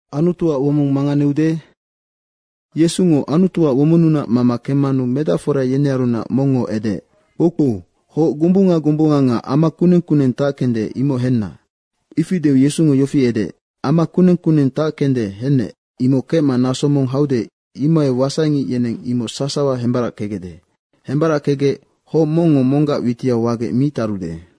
Anu Yesungo Anutuac womonnunac mama kemmanu medacfora yenearunac mongngo edeec, “Kpoukpou, hoc gombunga gombunga nga ama kuneng kuneng tackende, imoc henna.” Ifi deu Yesungo yofi edeec, “Ama kuneng kuneng tackenu hennec, imoc kecma naso mong haude, imohai wasaingic yeneng imoc sasawa hembarackegecde. Hembarackegec hoc mongngo monggac witiau wagec mi tarude.”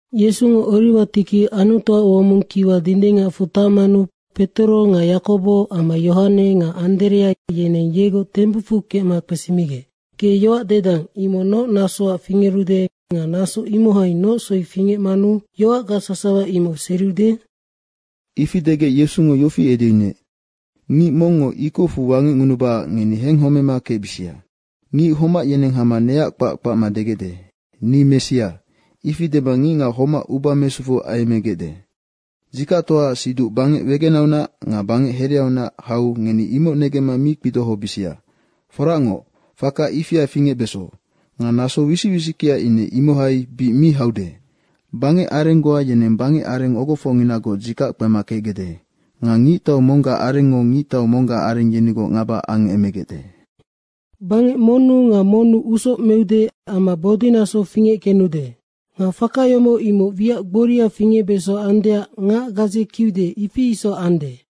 Yesungo Oriwa tikiu Anutuac womong kiwa dindingacfu tacmanu Petoro nga Yakobo amma Yohane nga Anderea, yeneng yegoc tembucfu kecma kpesimigec, “Ge yoac dedang, imoc noc nasoac fingerude nga naso imohai noc soi fingecmanu yoac sasawa imoc seriude?” Ifi degec Yesungo yofi edeyunuec, “Ngic mongngo ikocfu wangecngunubacac ngeni henghomema kecbisia. Ngic homac yeneng hama neac kpac kpacma degecde, ‘Ni Messia.’ ifi dema ngicngac homac uba mesufu ayemmegecde. Dzikactoaac siduc bangec wegenaunac nga bangec hereaunac hau ngeni imoc negemma mi kpidohobisia. Foracngoc, faka ifia fingecbeso. Nga naso wisic wisickea ine imohai bic mi haude. Bangecareng goa yeneng bangecareng ogofocnginagoc dzikac kpema kecgecde. Nga ngictau monggac arengngo ngictau monggac areng yenigoc ngaba angemegecde. Bangec monnu nga monnu usoc meude amma bodinaso fingeckenude. Nga faka yomoc, imoc wiac gboria fingecbeso andeac ngac gadze kiude ifi isoc ande.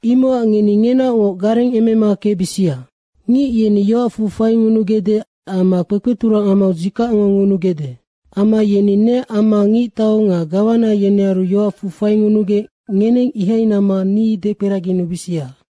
Imocac ngeni ngenaocngoc garengemema kecbisia. Ngic yeni yoacfu faingunugecde amma kpekpeturang amau dzikacngo ngunugecde. Amma yeni neac amma ngictau nga gawana yenearu yoacfu faingunugec ngeneng ihai namma ni dekperaginubisia.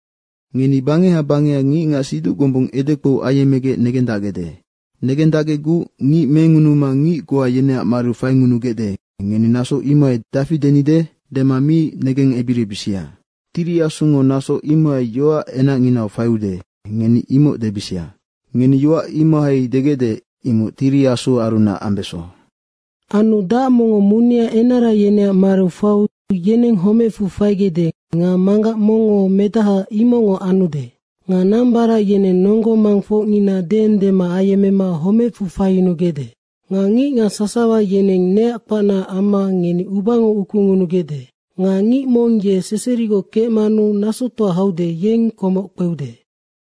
Ngeni bangeha bangeha ngicngac siduc gombung edekpou ayemmegec negendacgecguc ngic mengunuma ngic goa yeneac mariu faingunugecde, ngeni naso imohai, ‘Dafi denide?’ dema mi negengebiribisia. Tiri Asungo naso imohai yoac enacnginau faiude, ngeni imoc debisia. Ngeni yoac imohai degecde, imoc Tiri Asuarunac ambeso. Anu dac mongngo munea enara yeneac mariu faiu yeneng homecfu faigecde nga manggac mongngo medahaac imocngoc anude. Nga nambarac yeneng nonggo mangfocngina deendema ayemmema homecfu faiyunugecde. Nga ngicngac sasawa yeneng neac kpacnaac amma ngeni ubango ukungunugecde. Nga ngic mong ye seserigoc kecmanu nasotoa haude, yeng komoc kpeude.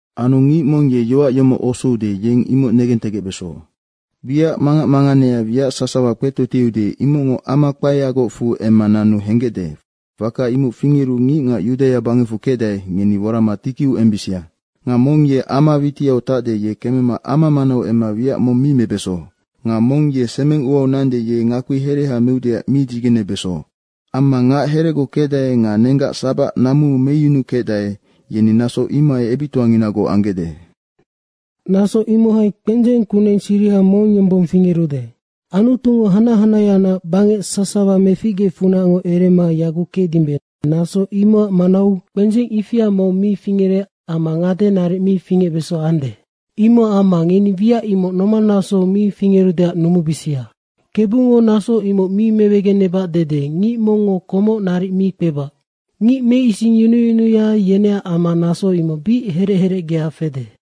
Anu ngic mong ye yoac yomoc osoude, yeng imoc negentegecbeso. Wiac mangac manganea wiac sasawa kpetotieude, imocngo ama kpaeagocfu emma nanu henggecde, faka imoc fingeru ngicngac Yudaia bangecfu kecdae, ngeni worama tikiu embisia. Nga mong ye ama witiau tacde, ye kemema ama manau emma wiac mong mi mebeso. Nga mong ye semeng uau nande, ye ngakpi hereha meudeac mi dzigenebeso. Amma ngac heregoc kecdae nga nenggac sabac namuu meyunukecdae, yeni naso imohai ebictoanginagoc anggecde. Naso imohai kpendzeng kuneng siriha mong yombong figerude. Anutungo hanac hanaheaunac bangec sasawa meficgeecfunacngoc erema yaguc kecdimbe, naso imocac manau kpendzeng ifia mong mi fingerec amma ngade naric mi fingecbesande. Imocac amma ngeni wiac imoc nomannasou mi fingerudeac numubisia. Kebungo naso imoc mi mewegenebac dede ngic mongngo komoc naric mi kpebac. Ngic meisingyunuyunuya, yeneac amma naso imoc bic herec herecgea fede.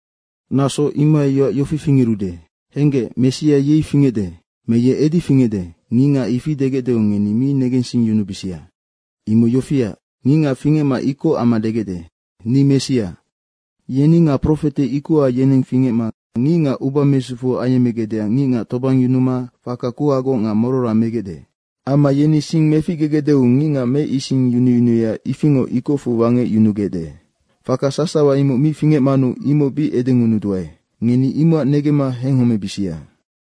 Naso imohai yoac yofi fingerude, ‘Henggec, Messia yei fingecde.’ me, ‘Ye edi fingecde.’ Ngicngac ifi degecdeu ngeni mi negensingyunubisia. Imoc yofiac, ngicngac fingecma ikoc amma degecde, ‘Ni Messia.’ yeni nga profete ikoha yeneng fingecma ngicngac uba mesufu ayemmegecdeac ngicngac tobangyunuma faka kuhagoc nga morora megecde. Amma yeni sing meficgegecdeu ngicngac meisingyunuyunuya ifingoc ikocfu wangecyunugecde. Faka sasawa imoc mi fingecmanu imoc bic edengunuduae. Ngeni imocac negemma henghomebisia.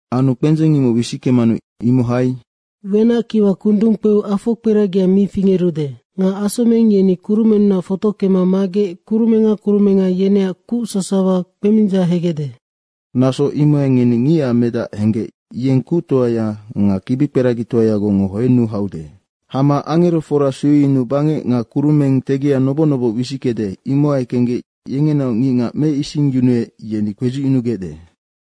Anu kpendzeng imoc wisickemanu imohai ‘wenackiwa kundung kpeu afokperagia mi fingerude. Nga asomeng yeni kurumennunac fotockema magec kurumenga kurumenga yeneac kuc sasawa kpemindzahegecde.’ Naso imohai ngeni Ngicac Medac henggec yeng kuctoaya nga kibikperagitoayagocngo hoennu haude. Hama angerofora sueyunuu bangec nga kurumeng tegia noboc noboc wisickede, imohai kenggec yengenaoc ngicngac meisingyunuec, yeni kpedzucyunugecde.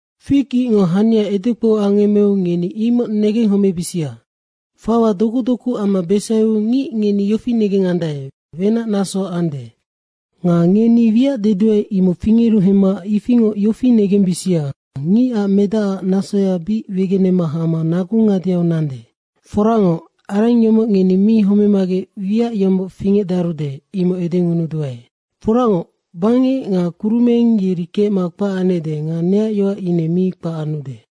Fig icngo hania edekpou angemmeu ngeni imoc negenghomebisia. Fawaya doku doku amma besaiu ngic ngeni yofi negengandae, wenac naso ande. Nga ngeni wiac dedua, imoc fingeru hemma ifingoc yofi negembisia, Ngicac Medac nasoya bic wegenema hama nagu ngadeau nandenoc. Foracngoc, areng yomoc ngeni mi homemagec wiac yomoc fingecdarude, imoc edengunuduae. Foracngoc, bangec nga kurumeng yeri kecma kpac anecde nga neac yoac ine mi kpac anude.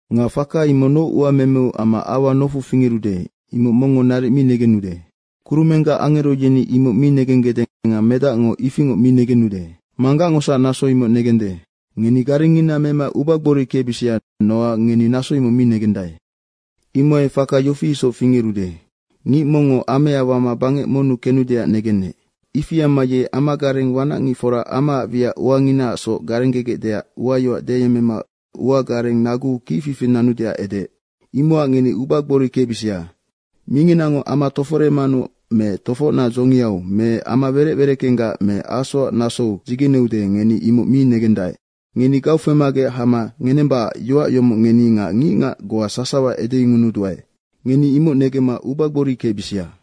Nga faka imoc noc uamemeu amma aua nofu fingerude, imoc mongngo naric mi negenude. Kurumenggac angero yeni imoc mi negenggecde nga Medacngo ifingoc mi negenude. Manggacngosac naso imoc negende. Ngeni garengngina mema ubagbori kecbisia. Nocac ngeni naso mi negendae. Imohai faka yofi isoc fingerude, ngic mongngo amea wama bangec monnu kenudeac negenec. Ifi amma ye amagareng wanacngicfora amaac wiac uanginaacsoc garenggegecdeac uayoac deyemmema nagugareng naguu kicfifi nanudeac edeec. Imocac ngeni ubagbori kecbisia. Minginango ama toforemanu me tofocnac dzongiau me ama werec wereckenggac me asoac nasou dzigeneude, ngeni imoc mi negendae. Ngeni gaufemagec hama ngenembacac yoac yomoc ngeni nga ngicngac goa sasawa edengunuduae. Ngeni imoc negemma ubagbori kecbisia.”